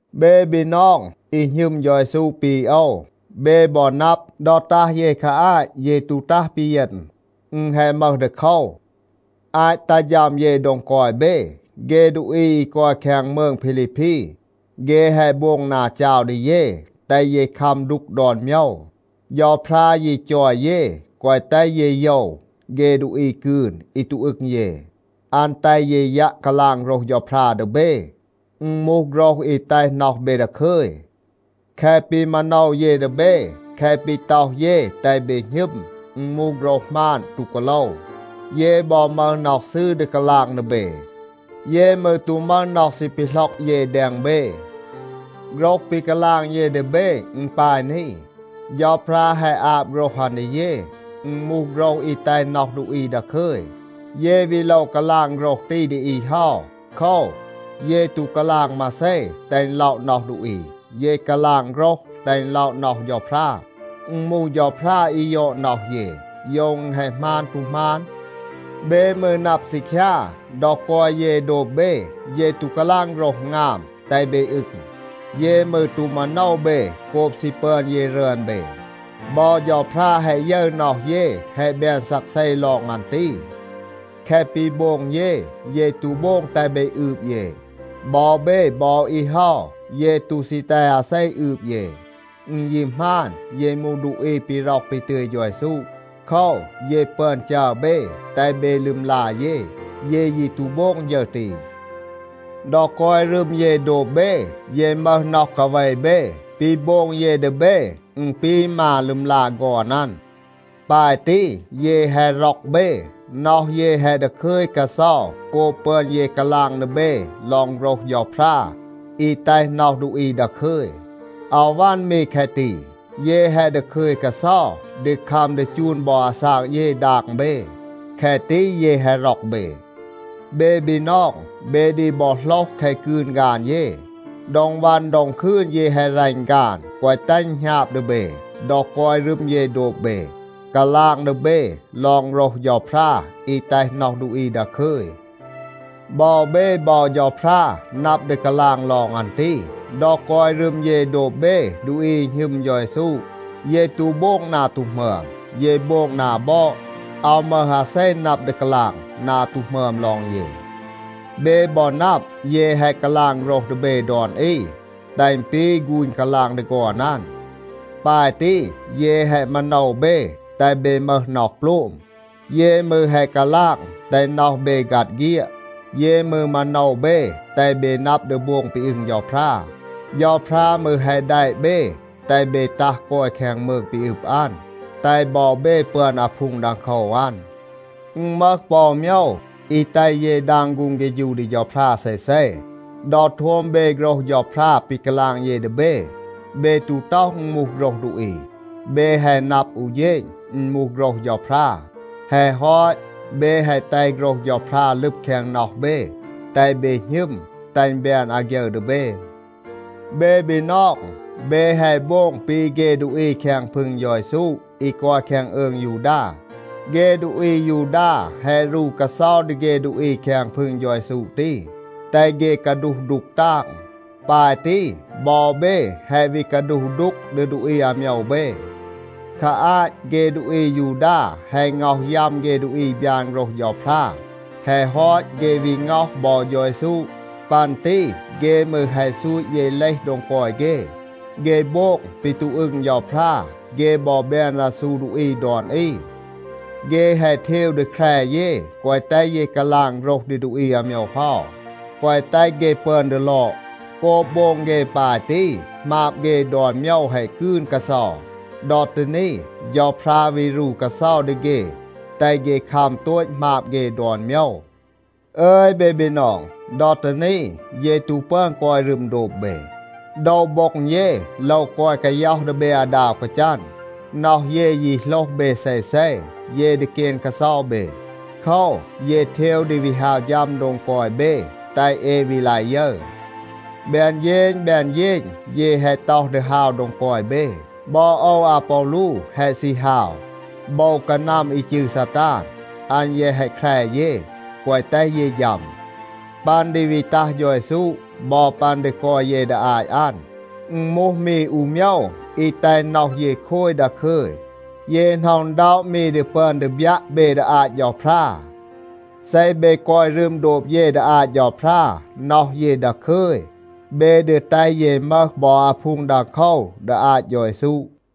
เบ บีนอง อี หณึม เฌา เยซู ปี โอว, เบ บอ นับ, ดอ ตัห เย คา อาต เย ตู ตัห ปีเยณ. อึณ แฮะ มึห ดีโคว. อาต ตัห ฌัม เย โดง กอย เบ, เฆ ดูอี อี กอย แคง มืง พีลีพี, เฆ แฮะ โบง นา จาว ดี เย, แตห เย คัม ดูก ดอน โมยว. เฌาพรา ยี จอย เย, แกวะ แตห เย โยว เฆ ดูอี กืน อี ตู อึง เย. อัน แตห เย ยัะ กาลาง โฆรห เฌาพรา ดี เบ. อึณ มูห โฆรห อี แตห น็อห เบ ดาคึย. แคะ ปี มาโนว เย ดี เบ, แคะ ปี ต็อห เย แตห เบ หณึม, อึณ มูห โฆรห หมาน ตู กาโลว. เย บอ มึห น็อห ซืร ดี กาลาง ดี เบ. เย มืร ตู มึห น็อห ซี ปีหล็อก เย แดง เบ. โฆรห ปี กาลาง เย ดี เบ, อึณ ปาย นี. เฌาพรา แฮะ อาบ โฆรห อัน ดี เย. อึณ มูห โฆรห อี แตห น็อห ดูอี ดาคึย. เย วี โลว กาลาง โฆรห ตี ดี อี เฮา. โคว, เย ตู กาลาง มาเซ, แตห อึณ ล็อะ น็อห ดูอี. เย กาลาง โฆรห, แตห อึณ ล็อะ น็อห เฌาพรา. อึณ มูห เฌาพรา อี ยอด น็อห เย, โยว อึณ แฮะ หมาน ตู หมาน. เบ มืร นับ ซีคยา, ดอ กอย เย โดบ เบ, เย ตู กาลาง โฆรห งาม, แตห เบ อึง. เย มืร ตู มาโนว เบ โกบ ซี ปึอน เย รึอน เบ. บอ เฌาพรา แฮะ ยึร น็อห เย, แฮะ แบน ซักเซ ลอง อัน ตี. แคะ ปี โบง เย, เย ตู โบง แตห เบ อืบ เย. บอ เบ บอ อี เฮา, เย ตู ซี แตห อาเซ อืบ เย. อึณ ยี หมาน, เย มูห ดูอี ปี ร็อห ปี ตึย เฌา เยซู. โคว, เย ปึอน จัร เบ, แตห เบ ลึมลา เย. เย ยี ตู โบง ฌึร ตี. ดอ กอย รึม เย โดบ เบ, เย มึห น็อห กาเว เบ. ปี โบง เย ดี เบ, อึณ ปี มา ลึมลา ฆอน อัน. ปาย ตี เย แฮะ ร็อก เบ. น็อห เย แฮะ ดาคึย กาเซา โกบ ปึอน เย กาลาง ดี เบ ลอง โฆรห เฌาพรา อี แตห น็อห ดูอี ดาคึย. อาว วัน มี แคะ ตี. เย แฮะ ดาคึย กาเซา ดี คัม ดี จูน บอ อาซาก เย ดาง เบ. แคะ ตี เย แฮะ ร็อก เบ. เบ บีนอง, เบ ดี บอ โหลห แคะ กืน ฆาน เย. ดอง วัน ดอง คืน เย แฮะ รัณ ฆาน แกวะ แตห อึณ หณาบ ดี เบ ดอ กอย รึม เย โดบ เบ, กาลาง ดี เบ ลอง โฆรห เฌาพรา อี แตห น็อห ดูอี ดาคึย. บอ เบ บอ เฌาพรา นับ ดี กาลาง ลอง อัน ตี. ดอ กอย รึม เย โดบ เบ ดูอี อี หณึม เฌา เยซู, เย ตู โบง นา ตู หมึอม. เย โบง นา บอด. อาว มึห อาเซ นับ ดี กาลาง นา ตู หมึอม ลอง เย. เบ บอ นับ, เย แฮะ กาลาง โฆรห ดี เบ ดอน อี, แตห อึณ ปี ฆูณ กาลาง ดี ฆอน อัน. ปาย ตี, เย แฮะ มาโนว เบ, แตห เบ มึห น็อห โปลม. เย มืร แฮะ กาลาง แตห น็อห เบ ฆัด เฆียด. เย มืร มาโนว เบ, แตห เบ นับ ดี โบง ปี อึง เฌาพรา. เฌาพรา มืร แฮะ แดะ เบ, แตห เบ ตัห กอย แคง มืง ปี อึบ อัน, แตห บอ เบ ปึอน อาพูง ดังโคว อัน. อึณ มึห ปอ อู โมยว อี แตห เย ดาง ฆูง เฆฌู ดี เฌาพรา เซเซ. ดอ โทม เบ โฆรห เฌาพรา ปี กาลาง เย ดี เบ, เบ ตู ต็อห, อึณ มูห โฆรห ดูอี. เบ แฮะ นับ อู เฌณ, อึณ มูห โฆรห เฌาพรา. แฮะ ฮอต, เบ แฮะ แตห โฆรห เฌาพรา ลึบ แคง น็อห เบ, แตห เบ หณึม, แตห อึณ แบน อาฆยึร ดี เบ. เบ บีนอง, เบ แฮะ โบง ปี เฆ ดูอี แคง พึง เฌา เยซู อี กอย แคง อืง ยูดา. เฆ ดูอี อายูดา แฮะ รู กาเซา ดี เฆ ดูอี แคง พึง เฌา เยซู ตี, แตห เฆ กาดูห ดูก ตาง. ปาย ตี บอ เบ แฮะ วี กาดูห ดูก ดี ดูอี อาโมยว เบ. คา อาต เฆ ดูอี อายูดา แฮะ ง็อห ยัม เฆ ดูอี อี บยาน โฆรห เฌาพรา. แฮะ ฮอต เฆ วี ง็อห บอ เฌา เยซู. ปัน ตี เฆ มืร แฮะ ซูต เย เลห โดง กอย เฆ. เฆ โบง ปี ตู อึง เฌาพรา. เฆ บอ แบน รันซู ดูอี ดอน อี. เฆ แฮะ เทว ดี แคร เย, แกวะ แตห เย กาลาง โฆรห ดี ดูอี อาโมยว เฮา, แกวะ แตห เฆ ปึอน ดี ลอด. โกบ โบง เฆ ปาย ตี, หมาบ เฆ ดอน โมยว แฮะ กืน กาเซา. ดอ ตี นี, เฌาพรา วี รู กาเซา ดี เฆ, แตห เฆ คัม โตต หมาบ เฆ ดอน โมยว. อึย เบ บีนอง, ดอ ตี นี เย ตู ปึอน กอย รึม โดบ เบ. โดว โบ็ง เย โลว กอย กาย็อห ดี เบ อาดา อู กาจัน. น็อห เย ยี โหลห เบ เซเซ. เย ดีเกน กาเซา เบ. โคว, เย เทว ดี วี ฮาว ฌัม โดง กอย เบ แตห เอ วี ลาย ยึร. แบน เฌณ แบน เฌณ เย แฮะ ต็อห ดี ฮาว โดง กอย เบ. บอ โอว อาปอลู แฮะ ซี ฮาว. โบว กานัม อี จืร ซาตาน, อัน แยะ แฮะ แคร เย, แกวะ แตห เย ฌัม. ปัน ดี วี ตัห เฌา เยซู บอ ปัน ดี กอย เย ดี อาต อัน, อึณ มูห มี อู โมยว, อี แตห น็อห เย โคย ดาคึย. เย หน็อะ อึณด็อะ มี ดี ปึอน ดี บยัะ เบ ดี อาต เฌาพรา. เซ เบ กอย รึม โดบ เย ดี อาต เฌาพรา, น็อห เย ดาคึย. เบ ดี แตห เย มึห บอ อาพูง ดังโคว ดี อาต เฌา เยซู.